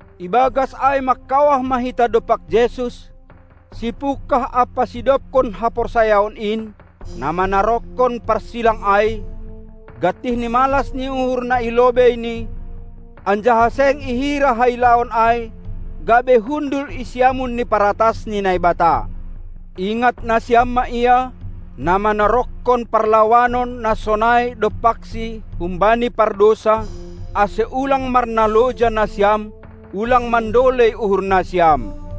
Ibagas ai mangkawah ma hita dompak Jesus, sipungkah ampa sidobkon haporsayaon in, na manaronkon parsilang ai, gantih ni malas ni uhur na i lobeini, anjaha seng ihira hailaon ai, gabe hundul i siamun ni paratas ni Naibata. Ingat nasiam ma Ia, na manaronkon parlawanon na sonai dompakSi humbani pardousa, ase ulang marnaloja nasiam, ulang mandolei uhur nasiam.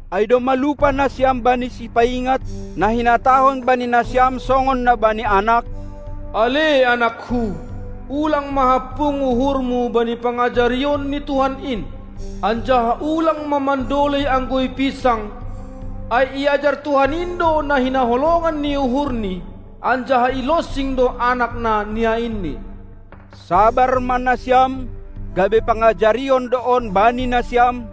Ai domma lupa nasiam bani sipaingat, na hinatahon bani nasiam songon na bani anak: Ale anakku, ulang ma hampung uhurmu bani pangajarion ni Tuhan in, anjaha ulang ma mandolei anggo ipinsang, ai iajar Tuhan in do na hinaholongan ni uhurni, anjaha ilonsing do anak na niainni. Sabar ma nasiam, gabe pangajarion do on bani nasiam,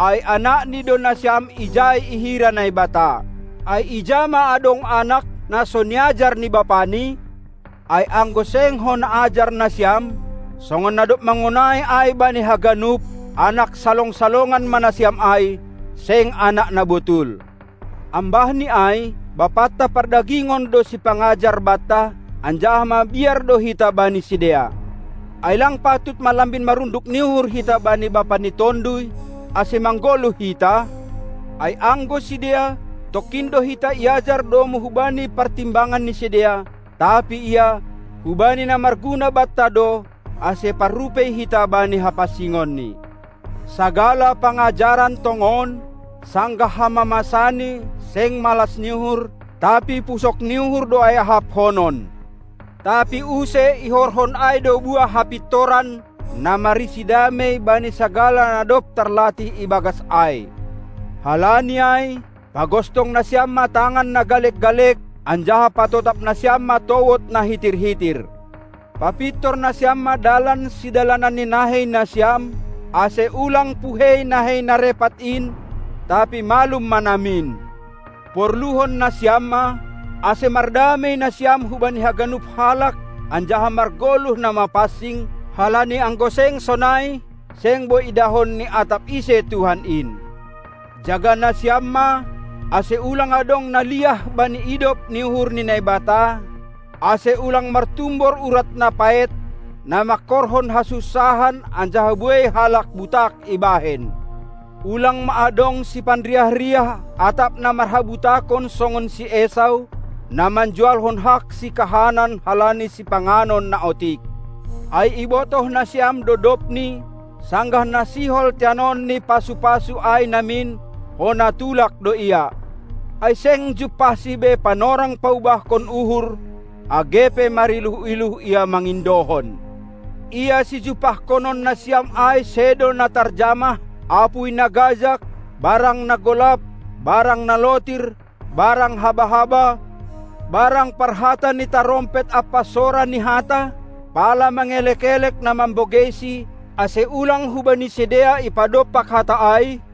ai anakNi do nasiam ijai ihira Naibata. Ai ija ma adong anak, na so niajar ni bapani? Ai anggo seng hona ajar nasiam, songon na dob mangonai ai bani haganup, anak salong-salongan ma nasiam ai, seng anak na botul. Ambah ni ai, bapanta pardagingon do sipangajar banta, anjaha mabiar do hita bani sidea; ai lang patut ma lambin marunduk ni uhur hita bani Bapa ni tonduy, ase manggoluh hita? Ai anggo sidea, tongkin do hita iajar domu hubani partimbangan ni sidea, tapi Ia, hubani na marguna banta do, ase parrupei hita bani hapansingonNi. Sagala pangajaran tongon, sanggah hamamasani seng malas ni uhur, tapi pusok ni uhur do ai ahaphonon; tapi use ihorhon ai do buah hapintoran na marisi damei bani sagala na dob tarlatih ibagas ai. Halani ai, pagostong nasiam ma tangan na galek-galek, anjaha patotap nasiam ma towod na hitir-hitir. Papintor nasiam ma dalan sidalanan ni nahei nasiam, ase ulang puhei nahei na repat in, tapi malum ma namin. Porluhon nasiam ma, ase mardamei nasiam hubani haganup halak anjaha margoluh na mapansing, halani anggo seng sonai, seng boi idahon ni atap ise Tuhan in. Jaga nasiam ma, ase ulang adong na liah bani idop ni uhur ni Naibata, ase ulang martumbor urat na paet, na mangkorhon hasunsahan anjaha buei halak butak ibahen. Ulang ma adong sipanriah-riah atap na marhabutakon songon si Esau, na manjualhon hak sikahanan halani sipanganon na otik. Ai ibotoh nasiam do dobni, sanggah na sihol teanonni pasu-pasu ai namin, hona tulak do ia; ai seng jumpahsi be panorang paubahkon uhur age pe mariluh-iluh ia mangindohon. Ia sijumpahkonon nasiam ai sedo na tarjamah, apuy na gajag, barang na golap, barang na lotir, barang haba-haba, barang parhata ni tarompet ampa sora ni hata, pala mangelek-elek na mambogeisi, ase ulang hubani sidea ipadompak hata ai;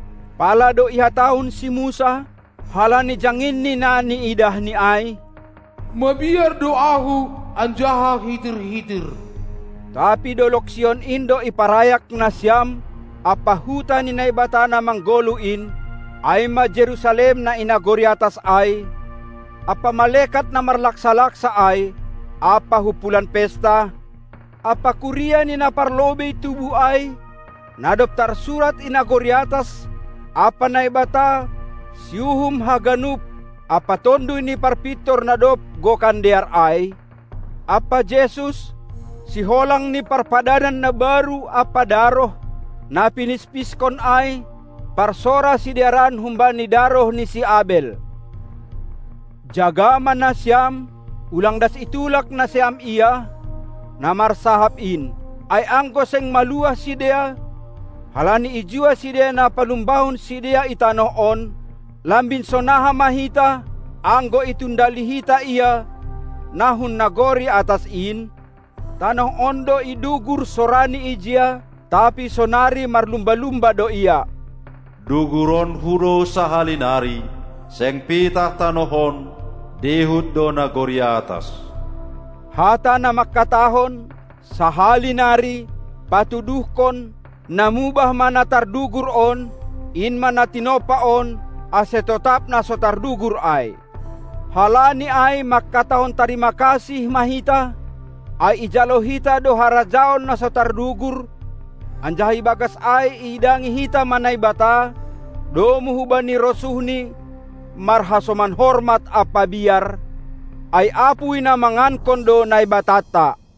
Pala do ihatahon si Musa, halani jangin ni na niidahni ai: Mabiar do ahu anjaha hitir-hitir. Tapi dolog Sion in do iparayak nasiam ampa huta ni Naibata na manggoluh in, ai ma Jerusalem na i nagori atas ai, ampa malekat na marlaksa-laksa ai, ampa humpulan pesta, ampa kuria ni na parlobei tubuh ai, na dob tarsurat i nagori atas, ampa Naibata, siuhum haganup, ampa tonduy ni parpintor na dob gokan dear ai, ampa Jesus, siholang ni parpadanan na baru ampa daroh, na pinispiskon ai, parsora sidearan humbani daroh ni si Abel. Jaga ma nasiam, ulang das itulak nasiam Ia, na marsahap in. Ai anggo seng maluah sidea, halani ijua sidea na palumbahon sidea i tanoh on, lambin sonaha ma hita, anggo itundali hita Ia, na hun nagori atas in? Tanoh on do idugur sorani ijia, tapi sonari marlumba-lumba do Ia: "Duguronku do sahali nari, seng pitah tanoh on, dihut do nagori atas." Hata na mangkatahon: "Sahali nari," patuduhkon, na mubah ma na tardugur on, in ma na tinompa on, ase totap na so tardugur ai. Halani ai mangkatahon tarima kasih ma hita, ai ijalo hita do harajaon na so tardugur, anjaha ibagas ai iidangi hita ma Naibata, domu hubani rosuhNi, marhasoman hormat ampa biar, ai apuy na mangankon do Naibatanta.